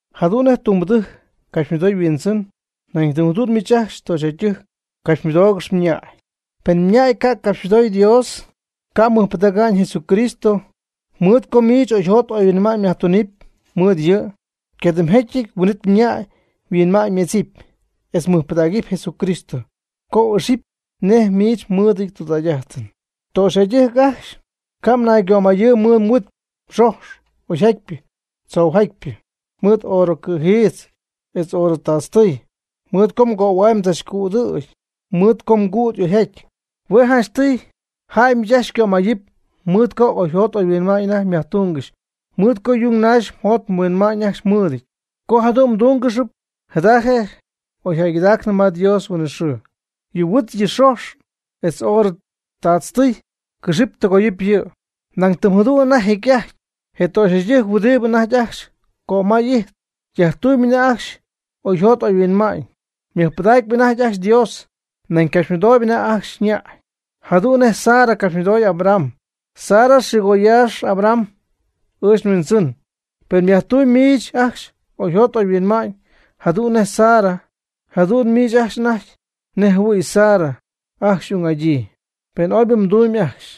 Jadu'n nej tumbɨdɨjc capxymɨdoy yhuindzɨn, nañ tɨm jadu'n miich ajcxy töxyjäydɨjc capxymɨdoogɨxy mñäy. Pen mñäy ca' capxymɨdoy Dios, ca' mɨjpɨdäga'ñ Jesucristo, mɨɨd co miich oyjot oyhuinma'ñ myajtunɨpy mɨɨd yɨ', ycadɨmjetyɨty huin'it mñäy yhuinma'ñymedzɨp etz mɨjpɨdägɨpy Jesucristo, co y'ixɨpy nej miich mmɨɨdɨty tudägy'ajtɨn. Töxyjäydɨjc ajcxy, ca' mnaygömayɨɨyb mɨɨd mhuit mxojx oyjatpyɨ tzoujatypɨ, mɨɨd oorɨ cɨ̈jiitz etz oorɨ taatztɨy, mɨɨd co mgöhuay mdzachcüdɨ̈gy mɨɨd cüd oyjatyp. Hue' janchtɨy jäy miich ajcxy xycömayɨp mɨɨd co oyjot oyhuinma'ñ anajty myajtungɨxy, mɨɨd co yung naxy mjot mhuinma'ñ ajcxy mɨɨdɨty. Co jadu'n mdúngɨxɨpy jada je' oy jäygɨdaacnɨ ma Dios huinɨxɨɨ. Yɨ mhuit yɨ mxojx etz oorɨ taatztɨy cɨxɨp tɨgoyɨp yɨ'. Nañ tɨm jadu'n anajty jecy'ajty je töxyjäydɨjc huɨdibɨ anajty ajcxy cömay ijtp, yajtuuñ anajty ajcxy oyjot oyhuinma'ñ, ymɨjpɨdacyp anajty ajcxy Dios, nañ ycapxymɨdooyb anajty ajcxy ñäy. Jadu'n nej Sara capxymɨdooy Abraham. Sara xɨɨgoyäxy Abraham: “Ɨɨch nhuindzɨn.” Pen myajtumyb miich ajcxy oyjot oyhuinma'ñ jadu'n nej Sara, jadu'n miich ajcxy anajty nej jɨhuɨ̈y Sara ajcxy xy'ung'adyii, pen ooybɨ mdunɨpy ajcxy,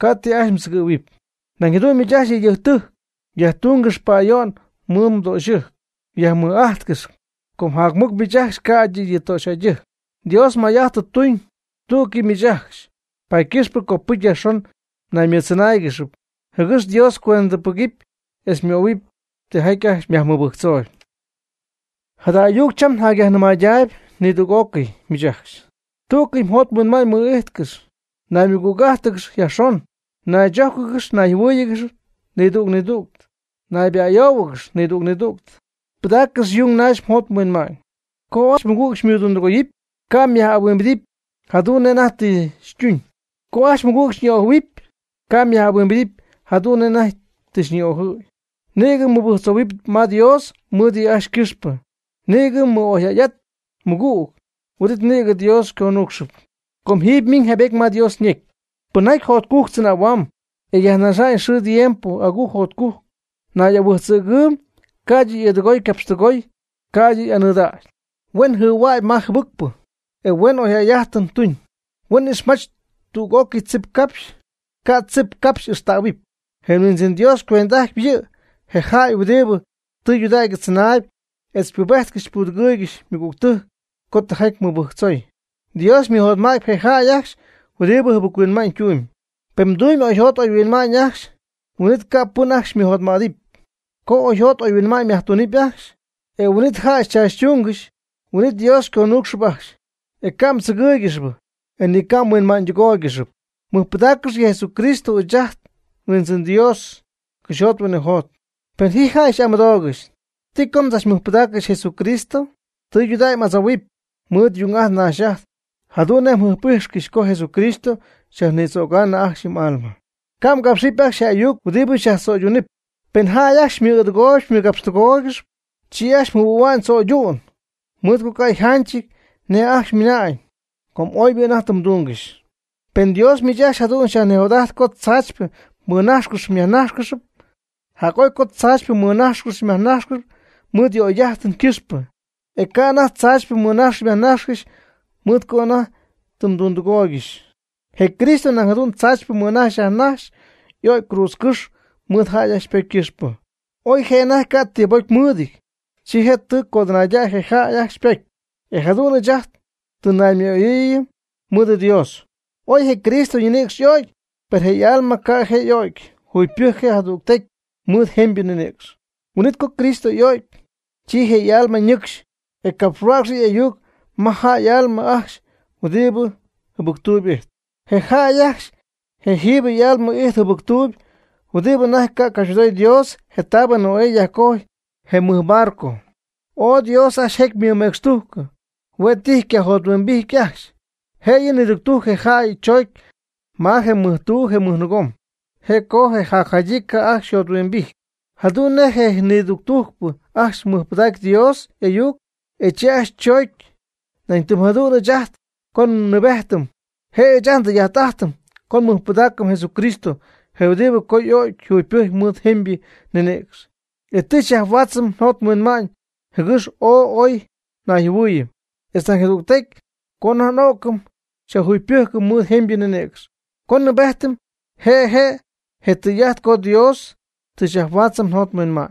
ca' ti ajcxy mdzɨgɨ̈huɨpy. Nañ jadu'n miich ajcxy yëydɨjctɨjc, yajtungɨx pa'ayo'n mɨɨd mdöxyɨjc, yajmɨj'ajtcɨx. Com jac mɨc miich ajcxy ca'ydɨ yɨ töxyjäydɨjc. Dios may'ajt tɨ tuñ tú'cɨy mɨɨd miich ajcxy, paady ycɨxpɨ copɨcy yajxon naymɨɨddzɨnáayɨgɨx jɨgɨx Dios cuendɨpɨgɨpy etz xymöhuɨpy tijaty ajcxy myajmɨbɨjctzooyb. Jada ayuc cham njacyajnɨmaydaayb nidüg'ócɨy miich ajcxy. Tú'cɨy mjot mhuinma'ñ mɨ'ijtcɨx, naymɨgüg'ájtɨgɨx yajxon, naychójcɨgɨx nayjɨhuɨ́ɨyɨgɨx nidüg nidüg, nayba'ayouhuɨgɨx nidüg nidüg, pɨdaaccɨx yung naxy mjot mhuinma'ñ. Co ajcxy mɨgüg xymɨdundɨgoyɨpy, ca' myaj'ahuimbidɨpy jadu'n nej anajty tɨ xytuñ. Co ajcxy mɨgüg xyñi'ojɨ̈huɨpy, ca' myaj'ahuimbidɨpy jadu'n nej anajty tɨ xyñi'ojɨ̈y. Nïgɨ nibɨjctzohuɨ' ma Dios mɨɨd yɨ' ajcxy ycɨxpɨ, nïgɨ mɨ'oyjäy'at mmɨgüg. Huin'it nïgɨ Dios xyconuucxɨp. Com jiiby ymiñ jaybety ma Dios ñecy: Pɨnjaty jotcujc tzɨnähuamb e yajnaxa'ñ xɨɨ tiempo agujc jotcujc, nay'ahuijtzɨ̈gɨɨb ca'ydɨ y'ɨɨdɨgooy ycapxtɨgooy, ca'ydɨ y'anɨɨdägy. Huen jɨhuägy ma je jɨbɨcpɨ e huen oyjäy'ajtɨn tuñ. Huen ixmach tüg'ócɨy tzipcapxy, ca' tzipcapxy ixtähuɨpy. Je Huindzɨn Dios ycuend'ajtpy yɨ' je jäy huɨdibɨ tɨydudägy tzɨnaayb etz ypubejtcɨxyp ypudɨgɨygɨxyp mɨgügtɨjc co tijaty mɨbɨjctzoy. Dios ymɨjotma'tpy je jäy ajcxy huɨdibɨ jɨbɨc-huinma'ñ tumb. Pen mdumyb oyjot oyhuinma'ñ ajcxy, huin'it ca' pɨn ajcxy xymɨjotmädɨpy. Co oyjot oyhuinma'ñ myajtunɨpy ajcxy e huin'it jäy xychaachytungɨxy, huin'it Dios xyconuucxɨp ajcxy, e ca' mdzɨgɨ́ɨygɨxɨpy, ni ca' mhuinma'ñydɨgóoygɨxɨpy. Mɨjpɨdaaccɨx yɨ Jesucristo ɨɨch ajt nHuindzɨn Dios cɨxyjot huinɨjot. Pen ji jäy xy'amɨdoogɨxy: ¿Ti co mdzachmɨjpɨdaaccɨxy Jesucristo? Tɨydudägy m'adzouhuɨpy mɨɨd yung'ajt nax'ajt jadu'n nej mjɨjp'ijxcɨxy co Jesucristo xyajnïdzögaanɨ ajcxy yɨ m'alma. Ca' mgapxɨpy ajcxy je ayuc huɨdibɨ xyajtzo'yduunɨp. Pen jäy ajcxy xymɨ'ɨɨdɨgooygɨxp xymɨgapxtɨgooygɨxp, chi ajcxy jɨhuɨ̈huamyb tzo'ydu'n mɨɨd co ca' yjanchɨty nej ajcxy ymɨna'ñ com oybɨ anajty tɨ mdungɨxy. Pen Dios miich ajcxy jadu'n xyajnijot'ajt co tzaachypɨ mmɨnájxcɨxɨpy myajnájxcɨxɨpy, jac'oy co tzaachypɨ mmɨnájxcɨxɨpy myajnájxcɨxɨpy mɨɨd yɨ m'oyjäy'ajtɨn ycɨxpɨ, e ca' anajty tzaachypɨ mmɨnajxcɨxy myajnajxcɨxy mɨɨd co anajty tɨ mdundɨgooygɨxy. Je Cristo nañ jadu'n tzaachypɨ mɨnajxy yajnajxy co y'o'cy cruudzcɨ́xy mɨɨd jäy ajcxy ypocy ycɨxpɨ. Oy je' anajty ca' tibocy mɨɨdɨty, chi je' tɨ codɨnäy je jäy ajcxy ypocy, e jadu'n ɨɨch ajt tɨ naymɨ'oyɨɨyɨm mɨɨdɨ Dios. Oy je Cristo ñinïcx y'o'cy, per je' y'alma ca' je' y'o'cy, jugypɨjcy je' jadügtecy mɨɨd jemybɨ ninïcx. Huin'it co Cristo y'o'cy, chi je' y'alma ñɨcxy, e capxhuäcxy yɨ' y'ayuc ma jäy y'alma ajcxy huɨdibɨ jɨbɨctuuyb ijtp. Je jäy ajcxy je' jiiby y'alma ijtp jɨbɨctuuby huɨdibɨ anajty ca' capxymɨdoy Dios. Je taab Noé yajcojy je mɨj barco, ooy Dios ajcxy jecy ymɨmecxtujcɨ, huen tijy cayjothuimbijty ajcxy. Jëyɨ niductujc je jäy choocy ma je mɨjtuu je mɨjnɨɨgom. Je' co je jacjadyii ca' ajcxy yjothuimbijty. Jadu'n nej je nidujctujcpɨ ajcxy mɨjpɨdacy Dios y'ayuc, e chi ajcxy choocy, nañ tɨm jadu'n ɨɨch ajt co nnɨɨbejtɨm je' ɨɨch ajt ndɨy'ajt'ajtɨm co nmɨjpɨdaacɨm Jesucristo je huɨdibɨ co y'o'cy jugypɨjc mɨɨd jemybɨ ninïcx, etz tɨ xyajhuaatzɨm njot nhuinma'ñ jɨgɨx ooy oy nayjɨhuɨɨyɨm, etz nañ jadügtecy co anajty n'o'cɨm xyajjugypɨjcɨm mɨɨd jemybɨ ninïcx. Co nnɨɨbejtɨm, je' je' je tɨy'ajt co Dios tɨ xyajhuaatzɨm njot nhuinma'ñ.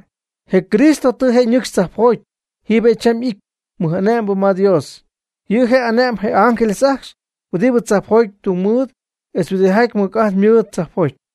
Je Cristo tɨ je' ñɨcxy tzajpjoty. Jiiby je' cham y'ity mɨj'ane'mbɨ ma Dios, yɨ' je' ane'mb je ángeles ajcxy huɨdi tzajpjoty tungmɨɨd etz huɨdijaty mɨc'ajt mɨɨd tzajpjoty.